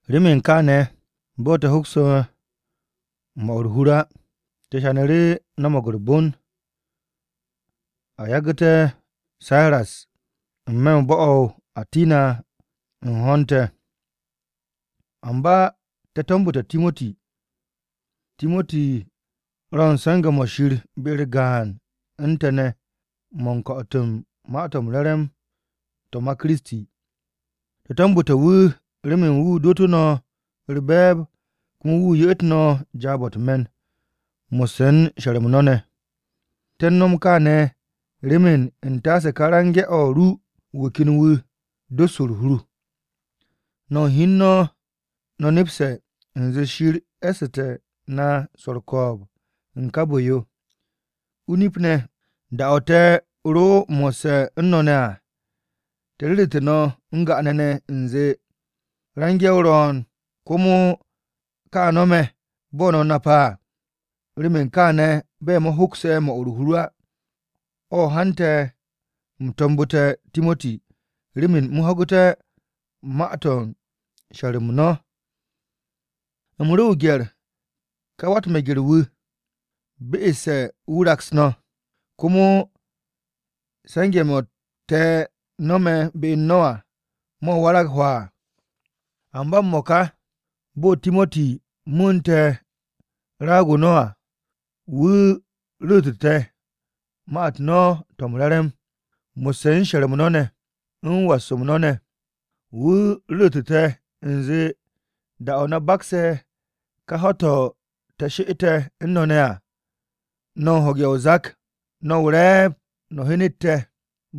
Remen kaane̱ bo̱ te̱ hokse̱ 'mo̱ u̱r-hur á, te̱ hyanu̱ru̱ no̱mo̱g u̱r-bon a yagu̱ me̱ te̱ Siras n-me̱ u̱n bo̱-o̱ o-Atina u̱n ho̱n te̱. Amba te̱ to̱mbu̱te̱ Timoti. Timoti ro̱ u̱n se̱nge̱-mo̱ Shir be-u̱r gaan u̱n te̱ ne̱ mo̱ u̱n ko̱'o̱t u̱n Ma-to̱ m-Re̱re̱m to̱ ma Kiristi. Te̱ to̱mbu̱te̱ wu̱ remen wu̱ dootú̱ no̱ u̱r-be̱e̱b komo wu̱ ye'et no̱ jaab-o̱ u̱t-me̱n mo̱sse̱ u̱n she̱r-m no̱ ne̱. Te̱ u̱n no̱m kaane̱ remen u̱n taase ka range̱-o̱ ru̱ wu̱ ken wu̱ dos u̱r-hur. No̱ u̱n hi u̱n no̱, no̱ nepse̱ u̱nze Shir e̱ssu̱te̱ na swo̱ u̱r-ko̱o̱b u̱n ká bu̱-yo. O-nip ne̱, da-o̱ te̱ ro mo̱sse̱ u̱n no̱ ne̱ à, te̱ ru̱ru̱te̱ no̱ n-ga'ane̱ ne̱ u̱nze, range̱-o ro̱o̱n, komo ka no̱me̱, bo̱ no̱ nape̱ à. Remen kaane̱, bo̱ me̱ hokse̱ 'mo̱ u̱r-hur á, o̱ hante̱ u̱m to̱mbu̱te̱ Timoti remen u̱m ho̱gu̱té̱ ma-to̱ u̱n she̱r-m no̱. U̱m ro o-gye̱r ka wa-u̱t-meger-wu̱, be'esse̱ wu̱ raks no̱, komo se̱nge̱-mo̱ te̱ no̱me̱ be u̱n no̱ à mo̱ warag hwaa. Amba m-mo̱ka, bo̱ Timoti mu̱u̱nte̱ raag-o no̱ à, wu̱ ru̱ru̱tu̱ te̱ ma-u̱t no̱ to̱ m-re̱re̱m mo̱sse̱ u̱n she̱r-m no̱ ne̱, u̱n was-m no̱ ne̱. Wu̱ ru̱ru̱tu̱ te̱ u̱nze da-o̱ no̱ bakse̱ ka ho̱-to̱ te̱ she'et u̱n no̱ ne̱ à, no̱ u̱n ho̱ge̱ o-zak. No̱ o-re̱e̱b no̱ hyenet te̱,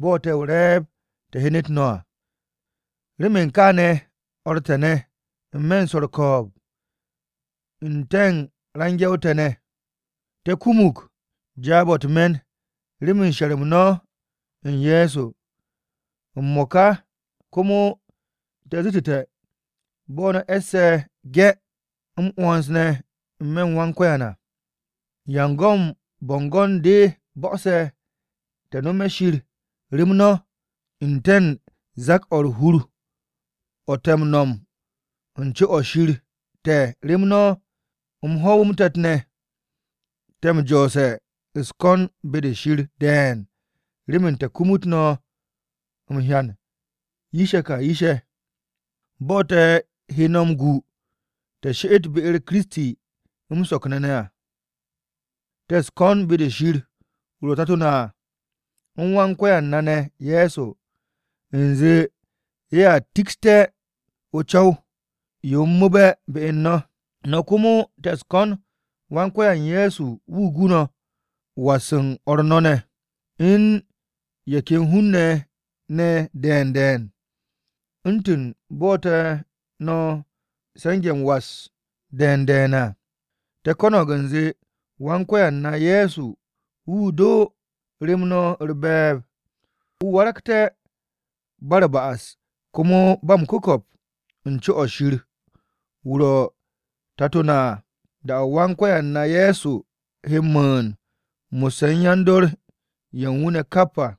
bo̱ te̱ o-re̱e̱b te̱ hyenet no̱ à. Remen kaane̱, o̱r te̱ ne̱ n-me̱ swo̱ u̱r-ko̱o̱b u̱n te̱ u̱n range̱-o te̱ ne̱, te̱ kumug jaab-o̱ u̱t-me̱n remen she̱r-m no̱ u̱n Ye̱so. M-mo̱ka, komo te̱ zu̱tu̱te̱, bo̱ no̱ e̱se̱ 'ge̱ m-'wo̱ns ne̱ n-me̱ u̱n Wan-Ko̱yan à. ¿Ya u̱n go̱n bo̱ngo̱n-de bo̱'o̱se̱ te̱ nome̱ Shir rem no̱, n-te̱ u̱n zak-o̱ u̱r-hur o̱ te̱ m-nom n-co o̱ Shir te̱ rem no̱? M-ho̱w, m-te̱t ne̱ te̱ m-jo̱o̱se̱ u̱s-ko̱n be-de Shir de̱e̱n remen te̱ kumut no̱ m-hyan yish-ye̱ ka yish-ye̱, bo̱ te̱ he no̱ m-gu no̱ sheret be-u̱r Kiristi m-so̱k ne̱ à. Te̱ u̱s-ko̱n be-de Shir, wu̱ ro̱ Tato-o na à, u̱n Wan-Ko̱yan na ne̱ Ye̱so, u̱nze ye̱a tikste̱ o-co̱w yo m-mu̱u̱be̱ be u̱n no̱. No̱ komo, te̱ u̱s-ko̱n Wan-Ko̱yan Ye̱so wu̱ gu no̱ was u̱n o̱r no̱ ne̱, u̱n ye̱ ken hun-ne̱ ne̱ de̱e̱n de̱e̱n, u̱ntu̱n bo̱ te̱ no̱ se̱nge̱-m was de̱e̱n de̱e̱n à. Te̱ ko̱no̱g u̱nze, Wan-Ko̱yan na Ye̱so wu̱ do rem no̱ u̱r-be̱e̱b, no̱ waragté̱ ba u̱r-ba'as komo ba m-ku̱ko̱p n-co o̱ Shir wu̱ ro̱, Tato na à da-o̱ Wan-Ko̱yan na Ye̱so he m-mu̱u̱n mo̱sse̱ u̱n yan-dor ye̱ u̱n wu̱ ne̱ kap à.